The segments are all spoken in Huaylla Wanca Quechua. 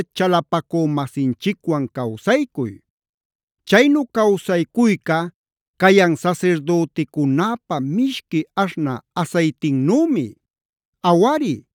chalapacü-masinchicwan cawsaycuy. Chaynu cawsaycuyca cayan sasirdüticunäpa mishqui aśhnä asaytinnümi. Awari,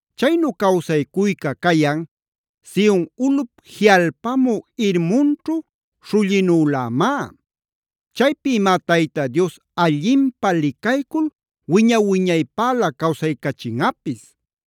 Chaynu cawsaycuyca cayan, Sion ulꞌup jiꞌalpamü Hermonćhu śhullinülämá. Chaypïmá Tayta Dios allinpä licaycul wiña-wiñaypälä cawsaycachinꞌapis.